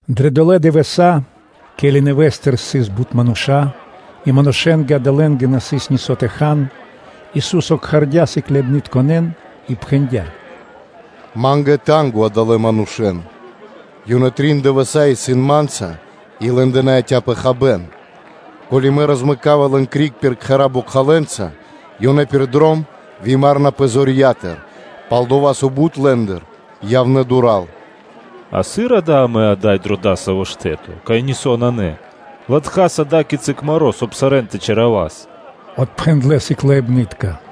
Дрэ дола дывэса́, ке́ли нэвэ́стыр сыс бут мануша́, и манушэ́нгэ адалэнгэ на сыс нисо́ тэ хан, Ису́со кхардя́ сыкляибнытконэ́н и пхэндя́: “Ма́нгэ исын танго (жалко) адалэн манушэ́н, ёнэ трин дывэса́ исын Ма́нца и лэ́ндэ на яця́пэ хабэ́н; ко́ли Мэ розмэкава криг лэн пир кхэра́ бокхалэнца, ёнэ пир дром вымарэнапэ зорья́тыр, пал-дова́ со бут лэ́ндыр явнэ́ дура́л.” “А сыр амэ ада́й пэ дасаво штэ́то, кай нисо́ нанэ, латхаса ада́кицы маро́, соб (кай) сарэ́н тэ чалякирас?” – отпхэндлэ́ сыкляибны́тка.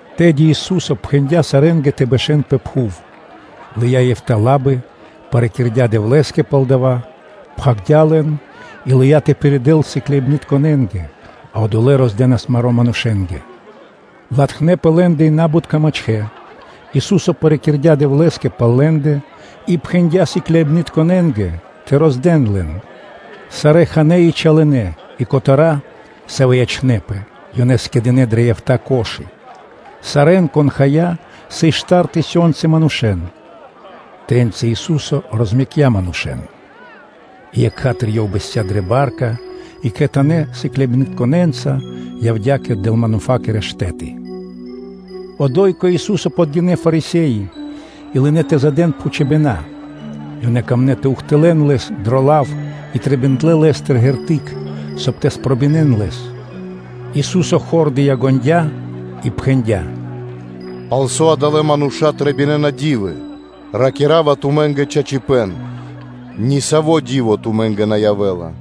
Тэды Ису́со пхэндя́ сарэ́нгэ тэ бэшэ́н пэ пхув, лыя́ эфта́ лабы, парикирдя Дэвлэ́скэ пал дава́, пхагирдя́ маро́ и лыя́ тэ пиридэл лэн сыкляибнытконэ́нгэ, а одолэ́ роздэнас маро́ манушэ́нгэ. Латхнэпэ лэ́ндэ и набутка мачхэ́; Ису́со парикирдя Дэвлэ́скэ пал лэ́ндэ и пхэндя́ сыкляибнытконэ́нгэ тэ роздэн лэн. Сарэ́ ханэ́ и чалынэ и котэра́, савэ́ ячнэ́пэ, ёнэ скэдынэ́ дрэ эфта́ корзи́ны (кхудэ́). Сарэ́н, кон хая, сыс штар тысёнцы манушэ́н. Тэ́ньци Ису́со розмэкця манушэ́н, И екха́тыр Ёв бэсця́ дрэ ба́рка и кхэтанэ́ сыкляибнытконэ́нца явдя́ кэ Далмануфакирэ штэ́ты. Одо́й кэ Ису́со подгинэ́ Фарисе́и и лынэ́ тэ допхэнэн Лэ́скэ. Лэ́нгэ трэиндя́ тэ ухтылэ́н Лэс дро лав и ёнэ трэбиндлэ Лэ́стыр ґерты́к (знаме́ниё), соб (кай) тэ спробинэн Лэс. Ису́со хор дыя́ ґондя́ и пхэндя́: “Палсо́ адалэ́ мануша́ трэбинэна ди́вы? Ракира́ва тумэ́нгэ чачипэ́н: ни сави́ ґерты́к тумэ́нгэ на явэ́ла.”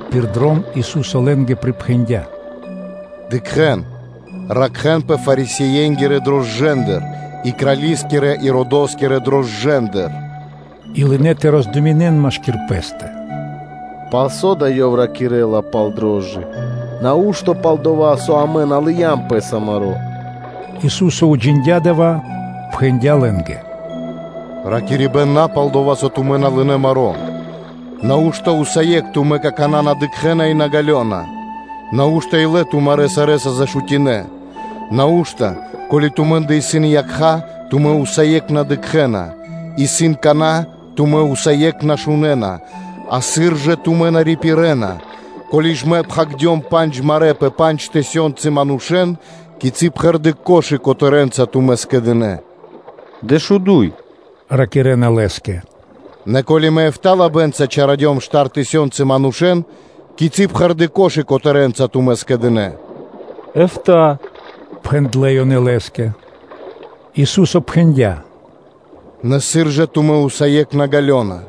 Пир дром Ису́со лэ́нгэ припхэндя́: “Дыкхэ́н, ракхэ́нпэ Фарисее́нгирэ рошчынатыр (закваскатыр) и крали́скирэ Иродоскирэ рошчынатыр.” И лынэ́ ёнэ тэ роздуминэн машки́р пэ́стэ: “Палсо́ да Ёв ракирэ́ла пал дрожджы? Нау́што палдова́, со амэ на лыям пэсо маро́?” Ису́со уджиндя́ дава́, пхэндя́ лэ́нгэ: “Ракирибэ́н на пал дова́, со тумэ́ на лынэ́ маро́. Нау́што усае́кх тумэ́ какана́ на дыкхэ́на, и на ґалёна? Нау́што илэ тумарэ́ сарэ́са зашутинэ? Нау́што, ко́ли тумэ́ндэ исын якха́, тумэ́ усае́кх на дыкхэ́на? Исын кана́, тумэ́ усае́кх на шунэ́на? А сыр жа тумэ́ на рипирэна. Ко́ли Мэ пхагирдём пандж марэ́ пэ пандж тысёнцы манушэ́ндэ, кицы́ пхэрдэ́ корзи́ны (кхудэ́) котэрэнца тумэ́ скэдынэ́?” “Дэшуду́й”, – ракирэ́на Лэ́скэ. “Нэ ко́ли Мэ эфта́ (битринэ́нгиро дэш) лабэнца чалякирдём штар тысёнцы манушэ́н, кицы́ пхэрдэ́ кхудэ́ котэрэнца тумэ́ скэдынэ́?” “Эфта́”, – пхэндлэ́ ёнэ Лэ́скэ. Ису́со пхэндя́: “Нэ сыр жа тумэ́ усае́кх на ґалёна?”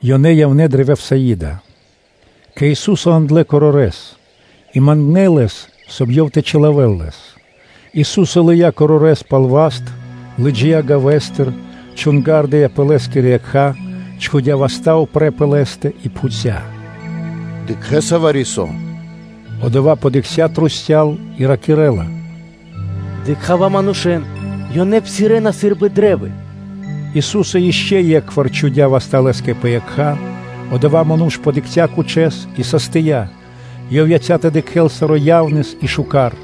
Ёнэ явнэ́ дрэ Вифсаида; кэ Ису́со яндлэ́ корорэс, и мангнэ́ Лэс, соб (кай) Ёв тэ чилавэл лэс. Ису́со лыя́ корорэс пал васт, лыджия́ гавэстыр, чунгардя пэ лэ́скирэ якха́, чхудя́ васта́ упрэ́ пэ лэ́стэ и пхуця́: “Дыкхэ́са вари-со?” Одова́ подыкхця́ трусця́л (кругом) и ракирэ́ла: “Дыкха́ва манушэ́н; ёнэ псирэ́на сы́рбы кашта́ (дрэвы).” Ису́со ишчо (инкэ́) е́кхвар чхудя́ васта́ лэ́скэ пэ якха́, одова́ ману́ш подыкхця́ кучэс и састия, ёв яця́ тэ дыкхэ́л саро́ яснэс и шука́р!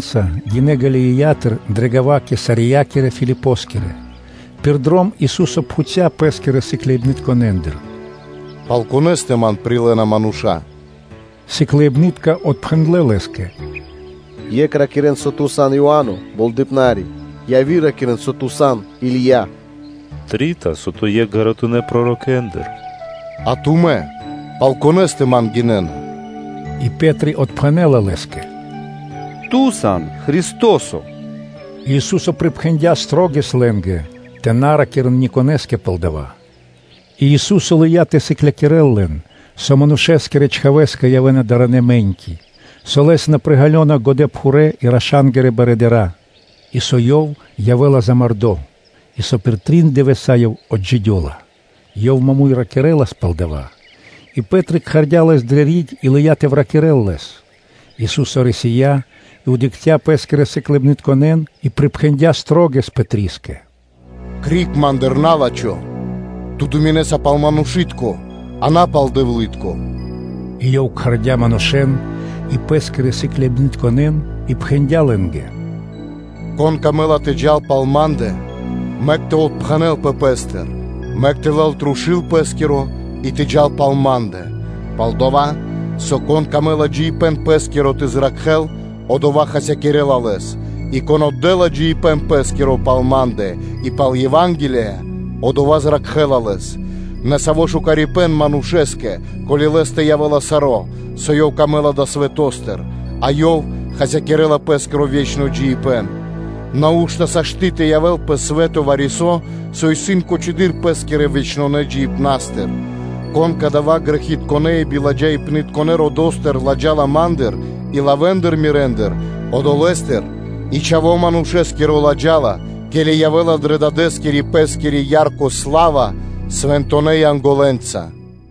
Ису́со сыкляибнытконэ́нца гинэ́ Галилеятыр дрэ гава́ Кесариякирэ Филипоскирэ. Пир дром Ису́со пхуця́ Пэ́скирэ сыкляибнытконэндыр: “Пал конэ́стэ Ман прилэ́на мануша́?” Сыкляибны́тка отпхэндлэ́ Лэ́скэ: “Екх ракирэ́на, со Ту сан Иа́но Болдэипнари; яви́р ракирэ́на, со Ту сан Или́я; трита, со Ту сан екх ґаратунэ́ пророкэндыр.” “А тумэ́ пал конэ́стэ Ман гинэ́на?” И Пэ́три отпхэнэ́ла Лэ́скэ: “Ту сан Христо́со.” И Ису́со припхэндя́ шылалэс лэ́нгэ тэ на ракирэ́н ни конэ́скэ пал дава́. И Ису́со лыя́ тэ сыклякирэ́л лэн, со Манушэ́скирэ Чхавэ́скэ явэ́на даранэ мэ́ньки, со Лэс на приґалёна годэпхурэ́ и раша́нгирэ барыдыра́, со Ёв явэ́ла мулякирдо, и пир трин дывэса́ Ёв отджидёла. Ёв маму́й (прямэс) ракирэ́лас пал дава́. И Пэ́три кхардя́ Лэс дрэ риг и лыя́ тэ выракирэл Лэс. Ису́со рисия́ и дыкхця́ Пэ́скирэ сыкляибнытконэ́н и припхэндя́ шылалэс Пэтрискэ: “Криг Ма́ндыр, на́лачхо! Ту думинэса пал манушы́тко, а на пал Дэвлы́тко.” И Ёв кхардя́ манушэ́н и Пэ́скирэ сыкляибнытконэ́н и пхэндя́ лэ́нгэ: “Конэ́стэ исын пэ ило́ тэ джал пал Ма́ндэ, мэк тэ отпхэнэлпэ пэ́стыр, мэк тэ лэл трушу́л пэ́скиро и тэ джал пал Ма́ндэ. Пал-дова́ со, кон мыслинэла дро ило́ джиибэ́н пэ́скиро тэ зракхэ́л, одова́ хасякирэ́ла лэс, и кон отдэ́ла джиибэ́н пэ́скиро пал Ма́ндэ и пал Ева́нгелия – одова́ зракхэ́ла лэс. Нэ саво́ лачхипэ́н явэ́ла манушэ́скэ, ко́ли лэ́стэ явэ́ла саро́, со лэ́скэ трэй далэ́ свэто́стыр, а ёв хасякирэ́ла пэ́скиро ве́чно джиибэ́н. Нау́што сашты́ (могинэ́ла) тэ явэ́л пэ свэ́то вари-со, со исын кучэдыр пэ́скирэ вечнонэ джиибнастыр? Кон кадава́ грэхитконэ́ и биладжаипнытконэ родо́стыр ладжала Ма́ндыр и лавэ́ндыр Мирэндыр, одолэ́стыр и Чхаво́ Манушэ́скиро ладжала, ке́ли явэ́ла дрэ Дадэ́скирэ – Пэ́скири ярко сла́ва свэнтонэ́ Янголэнца.”